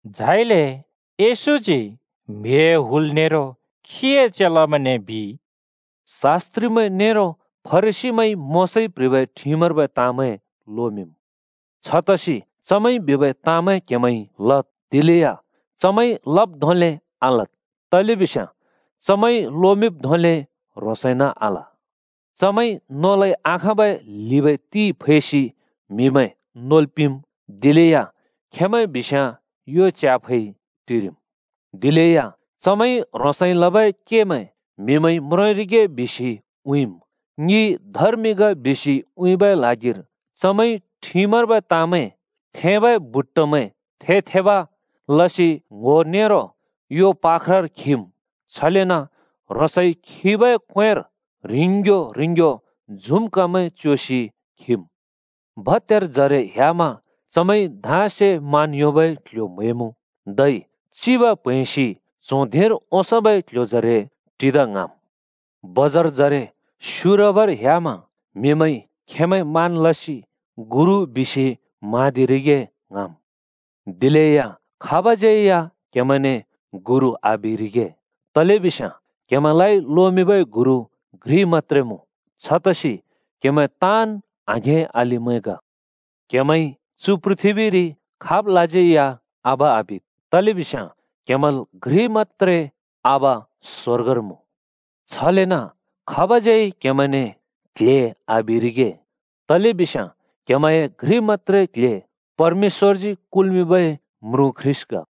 झाइले येशूजी म्‍हिए हुल नेरो खीए चेलामैंने बिइ: “शास्‍त्रिमैं नेरो फरिसीमैंइ मोशाइ प्‍ह्रिबै ठिमर्बै ताँमैं लोमिंम्। छतसि चमैंइ बिबै ताँमैं क्‍हेमैंइ लद्, दिलेया चमैंइ लब् धोंले आलद्, तलेबिस्याँ चमैंइ लोमिंब् धोंले ह्रोंसइन आल। चमैंइ नोलै आखाँब ल्हिबै ति फैसि म्हिमैं नोल् पिंम्, दिलेया खेंमैं बिस्‍याँ यो च्याफै टिरिम्। दिलेया चमैंइ ह्रोंसइ लबै केमैं म्हिमैंइ म्रोंरिगे बिसि उँइँम्। ङि धर्मि ग बिसि उँइँबै ल्हागिर चमैंइ ठिमर्बै ताँमैं थेंबै बट्टामैं थे-थेब लसि ङ्‍हो नेरो यो पाख्रार खिम्, छलेन ह्रोंसइ खिबै क्‍वेंर ह्रिंग्यो ह्रिंग्यो झुम्कामैं च्योसि खिम्। भत्यारजरे ह्‍यामा चमैंइ धाँसे मान योंबै क्‍ल्‍ह्‍यो म्‍हैमुँ। धै चिब प्हैंसि च्हों धिंर ओंसोंबै क्‍ल्‍ह्‍योजरे टिदा ङ्हाँम्। बजारजरे स्‍युरबर ह्‍यामा म्‍हिमैंइ खेंमैं मान लसि ‘गुरु’ बिसि म्हाँदिरिगे ङ्हाँम्। “दिलेया खाबज्यै या क्‍हेमैंने ‘गुरु’ आबिरिगे, तलेबिस्याँ क्‍हेमैंलाइ लोमिंबै गुरु घ्रि मत्‍त्रे मुँ, छतसि क्‍हेमैं ताँन् आघें-अलिमैं ग। क्‍हेमैंइ चु पृथ्‍बीरि खाबलाज्यै या आबा आबिद्, तलेबिस्याँ क्हेमैंल घ्रि मत्‍त्रे आबा स्वर्गर मुँ। छलेन खाबज्‍यै क्‍हेमैंने ‘क्ल्हे’ आबिरिगे, तलेबिस्याँ क्‍हेमैंए घ्रि मत्‍त्रे क्ल्हे परमेश्‍वरजी कुल्मिंबै म्रुँ ख्रीष्‍ट ग।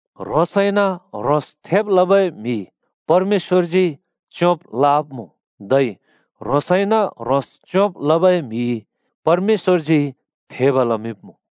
ह्रोंसइन ह्रोंस थेब लबै म्हि परमेश्‍वरजी च्‍योंब् लवाब्‍मुँ। धै ह्रोंसइन ह्रोंस च्योंब् लबै म्हि परमेश्‍वरजी थेब लमिंब्‍मुँ।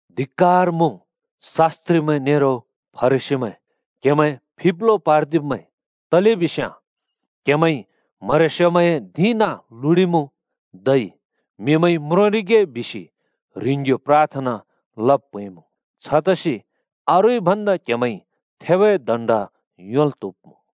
[धिक्‍कार मुँ, शास्‍त्रिमैं नेरो फरिसीमैं क्‍हेमैं फिब्लो पार्दिब्मैं! तलेबिस्याँ क्‍हेमैंइ म्हरेस्योमैंए धिं नाँ लुडिमुँ, धै म्हिमैंइ म्रोंरिगे बिसि ह्रिंग्‍यो प्राथना लब् प्हैंमुँ। छतसि अरूइ भन्दा क्‍हेमैंइ थेबै दण्‍ड योंल् त्‍हुब्‍मुँ।]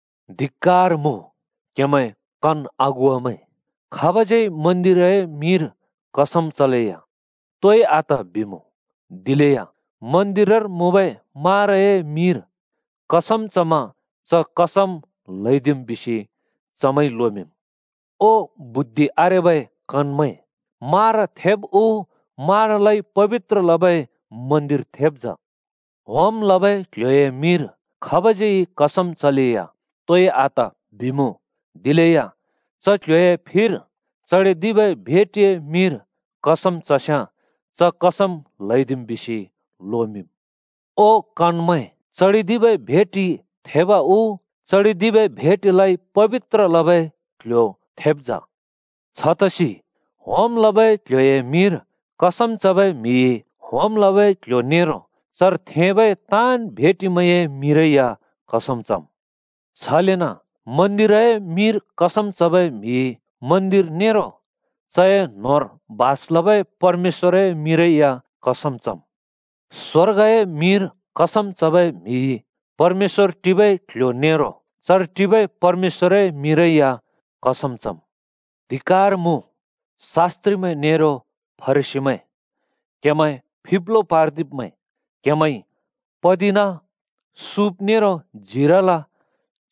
“धिक्‍कार मुँ, क्हेमैं कन अगुवामैं! ‘खाबज्यै मन्दिरए मिंर कसम चलेया तोइ आत बिमुँ, दिलेया मन्दिरर मुँबै माराए मिंर कसम चमा च कसम ल्‍हैदिम्,’ बिसि चमैंइ लोमिंम्। ओ बुद्धि आरेबै कनमैं, मारा थेब उ, मारालाइ पबित्र लबै मन्दिर थेब् जा? ‘होम लबै क्‍ल्‍ह्‍योए मिंर खाबज्यै कसम चलेया तोइ आत बिमुँ, दिलेया च क्ल्ह्‍योए फिर चडिदिबै भेटिए मिंर कसम चस्‍याँ च कसम ल्‍हैदिम्,’ बिसि लोमिंम्। ओ कनमैं, चडिदिबै भेटि थेब उ, चडिदिबै भेटिलाइ पबित्र लबै क्‍ल्‍ह्‍यो थेब् जा? छतसि होम लबै क्‍ल्‍ह्‍योए मिंर कसम चबै म्हिइ होम लबै क्‍ल्‍ह्‍यो नेरो चर थेंबै ताँन् भेटिमैंए मिंरै या कसम चम्। छलेन मन्दिरए मिंर कसम चबै म्हिइ मन्दिर नेरो चए न्होंर बास लबै परमेश्‍वरए मिंरै या कसम चम्। स्‍वर्गए मिंर कसम चबै म्हिइ परमेश्‍वर टिबै क्ल्ह्‍यो नेरो चर टिबै परमेश्‍वरए मिंरै या कसम चम्। “धिक्‍कार मुँ, शास्‍त्रिमैं नेरो फरिसीमैं क्‍हेमैं फिब्लो पार्दिब्मैं! क्हेमैंइ पतिना, सुँप नेरो जीराला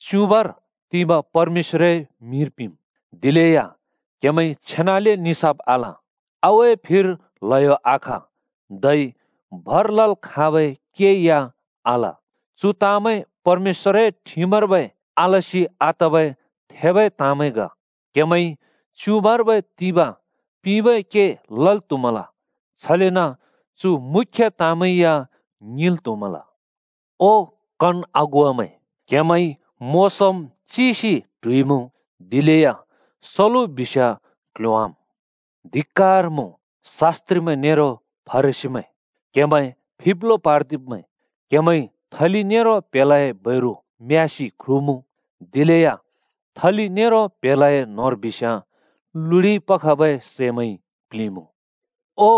च्युबाँरि तिबाँ परमेश्‍वरए मिंर पिंम्। दिलेया क्‍हेमैंइ छेनाले निसाफ आल, आगुए फिर ल्हयो आख धै भर लल् खाबै के या आल। चु ताँमैं परमेश्‍वरए ठिमर्बै आलसि आतबै थेबै ताँमैं ग। क्हेमैंइ च्युबाँर्बै तिबाँ पिंबै के लल् त्हुमल, छलेन चु मुख्‍य ताँमैं या ङिंल् त्‍हुमल। ओ कन अगुवा‍मैं, क्‍हेमैंइ मोसोम् (भुसुना) चिसि ट्हुइमुँ, दिलेया सलु बिस्याँ क्‍ल्‍ह्‍योंवाम्! “धिक्‍कार मुँ, शास्‍त्रिमैं नेरो फरिसीमैं क्‍हेमैं फिब्लो पार्दिब्मैं! क्‍हेमैंइ थलि नेरो प्‍हेलाए बैरु म्‍यासि ख्रुमुँ, दिलेया थलि नेरो प्‍हेलाए न्होंर बिस्याँ लुडिइ पखबै सैंमैंइ प्‍लिंमुँ। ओ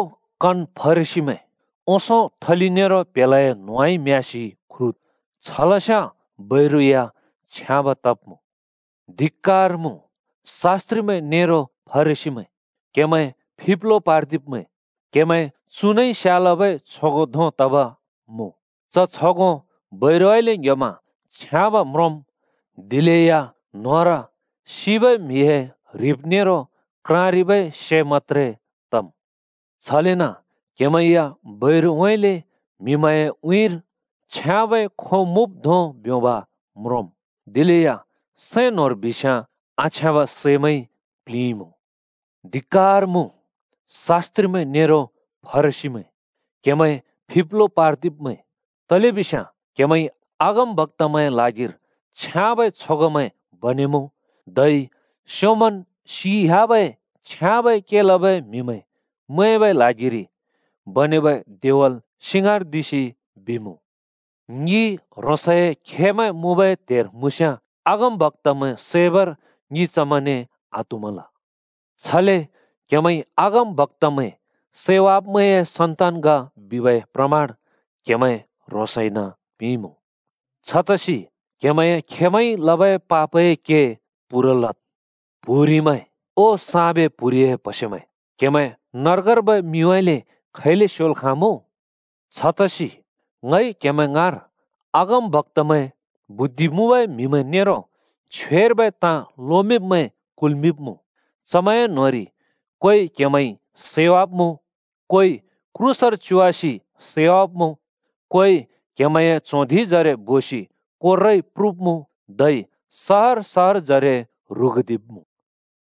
कन फरिसीमैं, ओंसों थलि नेरो प्‍हेलाए न्‍होंउँइँ म्यासि ख्रुद्, छलस्याँ बैरु या छ्याब तब्‍मुँ। “धिक्‍कार मुँ, शास्‍त्रिमैं नेरो फरिसीमैं क्‍हेमैं फिब्लो पार्दिब्मैं! क्‍हेमैं चुनइ स्‍यालबै छगों धों तब मुँ। च छगों बैरुउँइँले ङ्‌ह्‍योमा छ्याँब म्रोंम्, दिलेया न्‍होंर सिबै म्‍हिए ह्रिब नेरो क्राँरिबै से मत्‍त्रे तम्। छलेन क्‍हेमैं या बैरुउँइँले म्‍हिमैंए उँइँरि छ्याँबै खों मुँब् धों ब्योंब् म्रोंम्, दिलेया सैं न्‍होंर बिस्‍याँ आछ्याँब सैमैंइ प्‍लिंइमुँ। “धिक्‍कार मुँ, शास्‍त्रिमैं नेरो फरिसीमैं, क्‍हेमैं फिब्लो पार्दिब्मैं! तलेबिस्याँ क्‍हेमैंइ अगमबक्‍तामैंए ल्हागिर छ्याँबै छगोंमैं बनेमुँ, धै स्योंमन् सियाबै छ्याँबै के लबै म्‍हिमैं मैंबै ल्हागिरि बनेबै देवल सिंगार्दिसि बिमुँ, ‘ङि ह्रोंसए खेमैं मुँबै त्हेर मुँस्‍याँ अगमबक्‍तामैं सैबर ङि चमैंने आत्हुँमल।’ छले क्‍हेमैंइ अगमबक्‍तामैं सैवाब्‍मैंए सन्‍तान ग बिबै प्रमाण क्हेमैं ह्रोंसइन पिंइमुँ। छतसि क्‍हेमैंए खेमैंइ लबै पापए के पूरा लद्। प्‍हुरिमैं, ओ साँबे प्‍हुरिए प्हसेमैं! क्‍हेमैं नर्गर्बै मिउँइँले खैले स्योल् खाँमुँ? छतसि ङइ क्‍हेमैं ङाँर अगमबक्‍तामैं, बुद्धि मुँबै म्‍हिमैं नेरो छ्वेर्बै ताँ लोमिंब्मैं कुल्‍मिंब्मुँ। चमैंए न्होंरि कोइ क्हेमैंइ सैवाब्‍मुँ, कोइ क्रूसर च्‍योवासि सैवाब्‍मुँ, कोइ क्हेमैंए च्हों धिंजरे बोसि कोर्राइ प्रुब्मुँ, धै सहर-सहरजरे ‍ह्रुगुदिब्मुँ।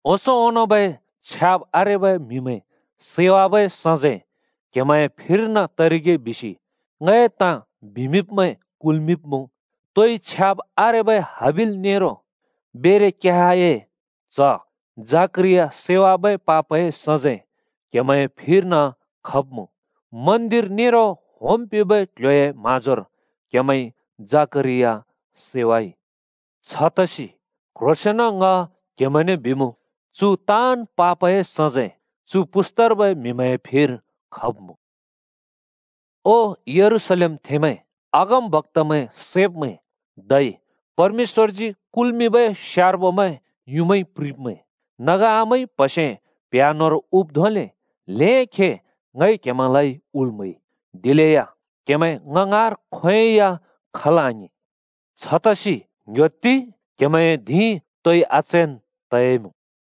ओंसों ओंनोंबै छ्याब् आरेबै म्‍हिमैं सैवाबै सजैं क्‍हेमैंए फिर्न तरिगे बिसि ङए ताँ बिमिंब्मैं कुल्मिंब्‍मुँ। तोइ छ्याब् आरेबै हाबिल नेरो बेरेक्याहए च्‍ह जकरिया सैवाबै पापए सजैं क्‍हेमैंए फिर्न खब्मुँ। मन्दिर नेरो होम् पिंबै क्‍ल्‍ह्‍योए म्‍हाँजोर क्‍हेमैंइ जकरिया सैवाइ। छतसि क्ह्रोंसेंन ङ क्हेमैंने बिमुँ, चु ताँन् पापए सजैं चु पुस्तार्बै म्‍हिमैंए फिर खब्‍मुँ। “ओ यरूशलेमथेंमैं, अगमबक्‍तामैं सैब्मैं, धै परमेश्‍वरजी कुल्मिंबै स्यार्बोमैं युँमाइ प्रिंब्मैं। नगा आमाइ प्हसेंमैं प्ह्‍या न्होंर हुब् धोंले ल्‍हें खे ङइ क्‍हेमैंलाइ हुल् म्‍हैइ, दिलेया क्‍हेमैं ङ ङाँर खोंयोंइ या खल् आङिं! छतसि ङ्‍ह्‍योत्ति, क्‍हेमैंए धिं तोइ आचैन् तयाइमुँ।